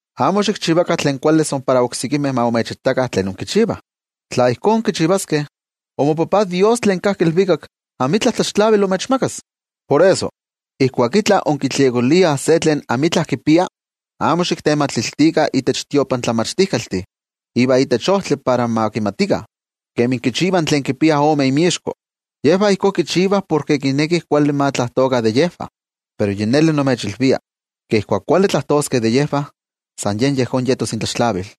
’Amo xikchivakah tlen kuali san para oksekimeh ma imechitakah tlen inkichivah. Tla ijkó inkichivaskeh, imoTajtzin Dios tlen kajki ilvikak amitla tlaxtlavili imechmakas. Por eso, ijkuak itla inkitliokoliah se tlen amitla kipia, amo xiktematiltikah itech tiotlamachtijkaltih ivan itech ojtli para ma kimatikah, kemi kichivah tlen kipiah ome inmixko, yejvah ijkó kichivah porke kinekih kuali ma tlajtokah de yejvah. Pero yi neli nimechilvia, ke ijkuak kuali tlajtoskeh de yejvah, san yen yejón yetos intlaxtlavil.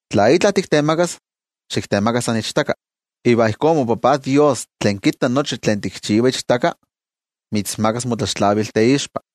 Tla itla tiktemakas, xiktemaka san ichtaka. Iva ijkó moTajtzin Dios tlen kitta nochi tlen tikchiva ichtaka, mitzmakas motlaxtlavil teixpa.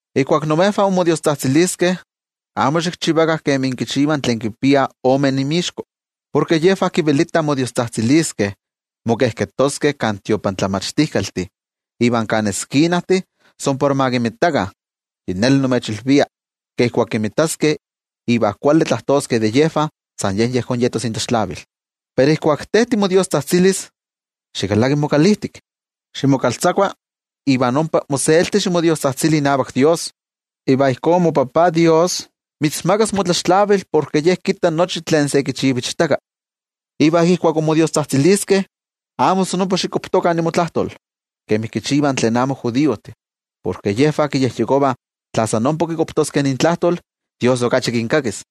’Ijkuak imejvah inmodiostzajtziliskeh, amo xikchivakah kemi kichivah tlen kipiah ome inmixko, porke yejvah kivelitah modiostzajtziliskeh mokejketoskeh kan tiotlamachtijkaltih iva kan eskinajtih san para ma kinmitakah. Yi neli nimechilvia ke ijkuak kinmitaskeh iva kuali tlajtoskeh de yejvah, san yen yejón yetos intlaxtlavil. Pero te ijkuak timodiostzajtzilis, xikalaki mokalijtik, ximokaltzakua iva ompa moselti ximodiostzajtzili inavak Dios. Iva ijkó moTajtzin Dios mitzmakas motlaxtlavil porke Ye kitta nochi tlen se kichiva ichtaka. ’Iva ijkuak inmodiostzajtziliskeh amo san ompa xikuakuaptokah imotlajtol kemi kichivah tlen amo judiojtih, porke yejvah kiyejyekovah tla san ompa kikuaptoskeh intlajtol, Dios okachi kinkakis.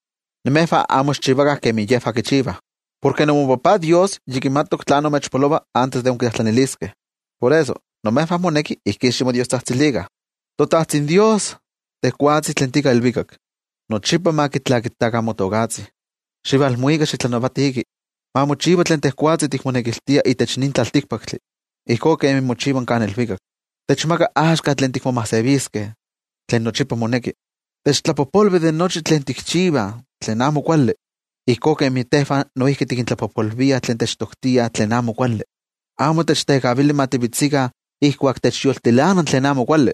Imejvah amo xikchivakah kemi yejvah kichivah, porke imoTajtzin Dios yi kimati tlán imechpolova antes de inkitlajtlaniliskeh. Por eso, imejvah moneki ijkí ximodiostzajtzilikah: ToTajtzin Dios, tejwatzi tlen tika ilvikak, nochipa ma kitlakitakah motokatzi. Xivalmuika xitlanavatiki. Ma mochiva tlen tejwatzi tikmonekiltia itech nin tlaltikpaktli, ijkó kemi mochiva kan ilvikak. Techmaka axka totlakual tlen nochipa moneki. Techtlapojpolvi de nochi tlen tikchivah tlen amo kuali, ijkó kemi tejvah noijki tikintlapojpolviah tlen techtoktiah tlen amo kuali. Amo techtekavili ma tivetzikah ijkuak techyoltilana tlen amo kuali,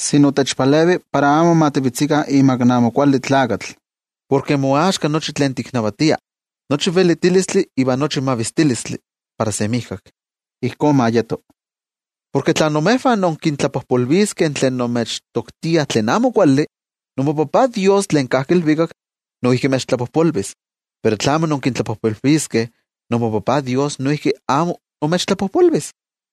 sino techpalevi para amo ma tivetzikah imak in Amo Kuali Tlakatl. Porke moaxka nochi tlen tiknavatia, nochi in velitilistli iva nochi in mavistilistli, para semijkak. Ijkó ma yeto. ’Porke tla imejvah inkintlapojpolviskeh tlen imechtoktiah tlen amo kuali, imoTajtzi Dios tlen kajki ilvikak noijki imechtlapojpolvis. Pero tla amo inkintlapojpolviskeh, imoTajtzi Dios noijki amo imechtlapojpolvis.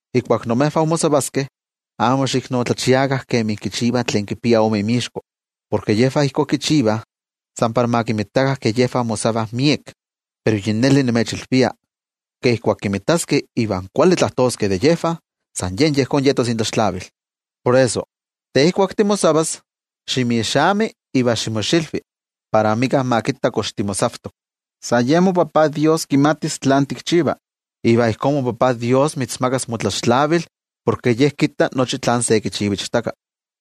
’Ijkuak imejvah inmosavaskeh, amo xiiknotlachiakah kemi kichivah tlen kipiah ome inmixko, porke yejvah ijkó kichivah san para ma kinmitakah ke yejvah mosavah miek. Pero yi neli nimechilvia ke ijkuak kinmitaskeh iva kuali tlajtoskeh de yejvah, san yen yejón yetos intlaxtlavil. Por eso, te ijkuak timosavas, ximixami iva ximoxilvi, para amika ma kimati kox timosavtok. San yen moTajtzi Dios kimatis tlán tikchiva. Iva ijkó moTajtzi Dios mitzmakas motlaxtlavil porke Ye kitta nochi tlen se kichiva ichtaka.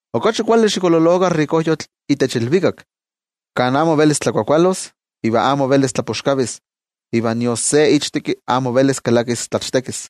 Okachi kuali xikololokah tlen kipia miek ipati itech ilvikak, kan amo velis tlakuakualos iva amo velis tlapoxkavis, iva nion se ichtekki amo velis kalakis tlachtekis.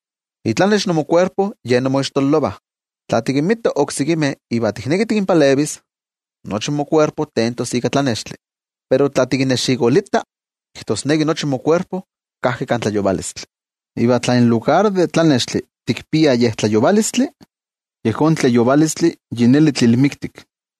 ’Itlanex imokuerpo yen imoixtololovah. Tla tikinmita oksekimeh iva tikneki tikinpalevis, nochi mokuerpo tentos ika tlanextli. Pero tla tikinnexikolita, kijtosneki nochi mokuerpo kajki kan tlayovalotl. Iva tla en lugar de tlanextli tikpia yej tlayovalotl, ¡yejón tlayovalotl yi neli tlilmiktik!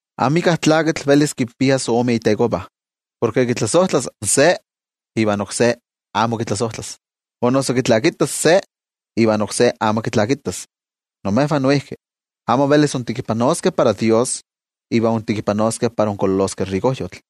’Amika tlakatl velis kinpias ome itekovah, porke kitlasojtlas in se ivan oksé amo kitlasojtlas, o noso kitlakitas in se ivan oksé amo kitlakitas. Imejvah noijki, amo velis intekipanoskeh para Dios iva intekipanoskeh para inkololoskeh tominkayotl.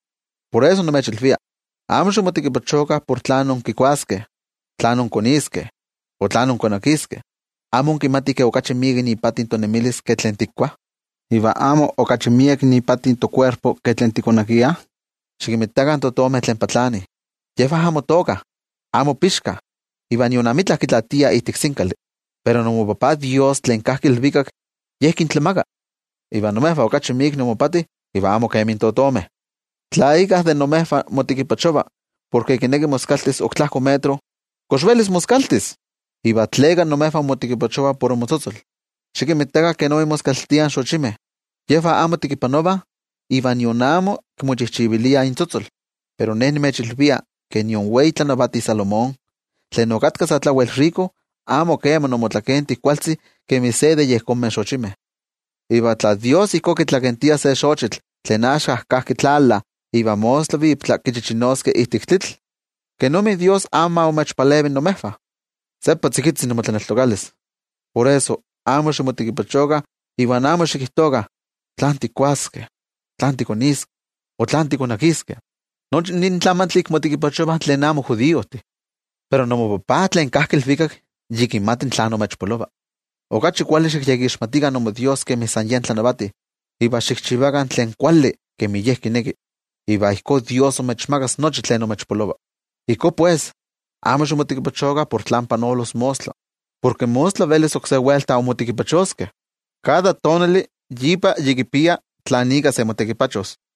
’Por eso nimechilvia, amo ximotekipachokah por tlán inkikuaskeh, tlán inkoniskeh o tlán inkonakiskeh. ¿Amo inkimatih ke okachi miek ipati tonemilis ke tlen tikuah? ¿Iva amo okachi miek ipati tokuerpo ke tlen tikonakiah? Xikimitakah in totomeh tlen patlanih, yejvah amo tookah, amo pixkah, iva nion amitla kitlaatiah ijtik sinkali. Pero imoTajtzi Dios tlen kajki ilvikak yen kintlamaka. Iva imejvah okachi miek inmopati iva amo kemi totomeh. Tla íkka de imejvah motekipachova porke kineki moskaltis ok tlajko metro, ¿kox velis moskaltis? ’¿Iva tleka imejvah inmotekipachovah por inmotzotzol? Xikinmitakah kenik moskaltiah in xochimeh, yejvah amo tekipanovah iva nion amo kimochijchiviliah intzotzol. Pero Ne nimechilvia, ke nion wei tlanavati Salomón tlen okatka sa tlawel tomine amo keman omotlakenti kualtzi kemi se de yejonmeh xochimeh. Iva tla Dios ijkó kitzotzoltia in xivitl tlen axka kajki tlala iva mostla viptla kichichinoskeh ijtik tlitl, ¿kenomi in Dios amo ma imechpalevi imejvah? ¡Seppa tzikitzi imotlaneltokalis! Por eso, amo ximotekipachokah iva amo xikijtokah: “¿Tlán tikuaskeh? o ¿tlán tikoniskeh? o ¿tlán tikonakiskeh?” Nochi nin tlamantli ika motekipachovah tlen amo judiojtih. Pero imoTajtzi Dios tlen kajki ilvikak yi kimati tlán imechpolova. Okachi kuali xikyekixmatikah imoDios kemi san Ye tlanavati iva xikchivakah tlen kuali kemi Ye kineki, iva ijkó Dios imechmakas nochi tlen imechpolova. Ijkó pues, amo ximotekipachokah por tlen panolos mostla, porke mostla velis oksé welta inmotekipachoskeh. Kada tonali ipa yi kipia tlan ika se motekipachos.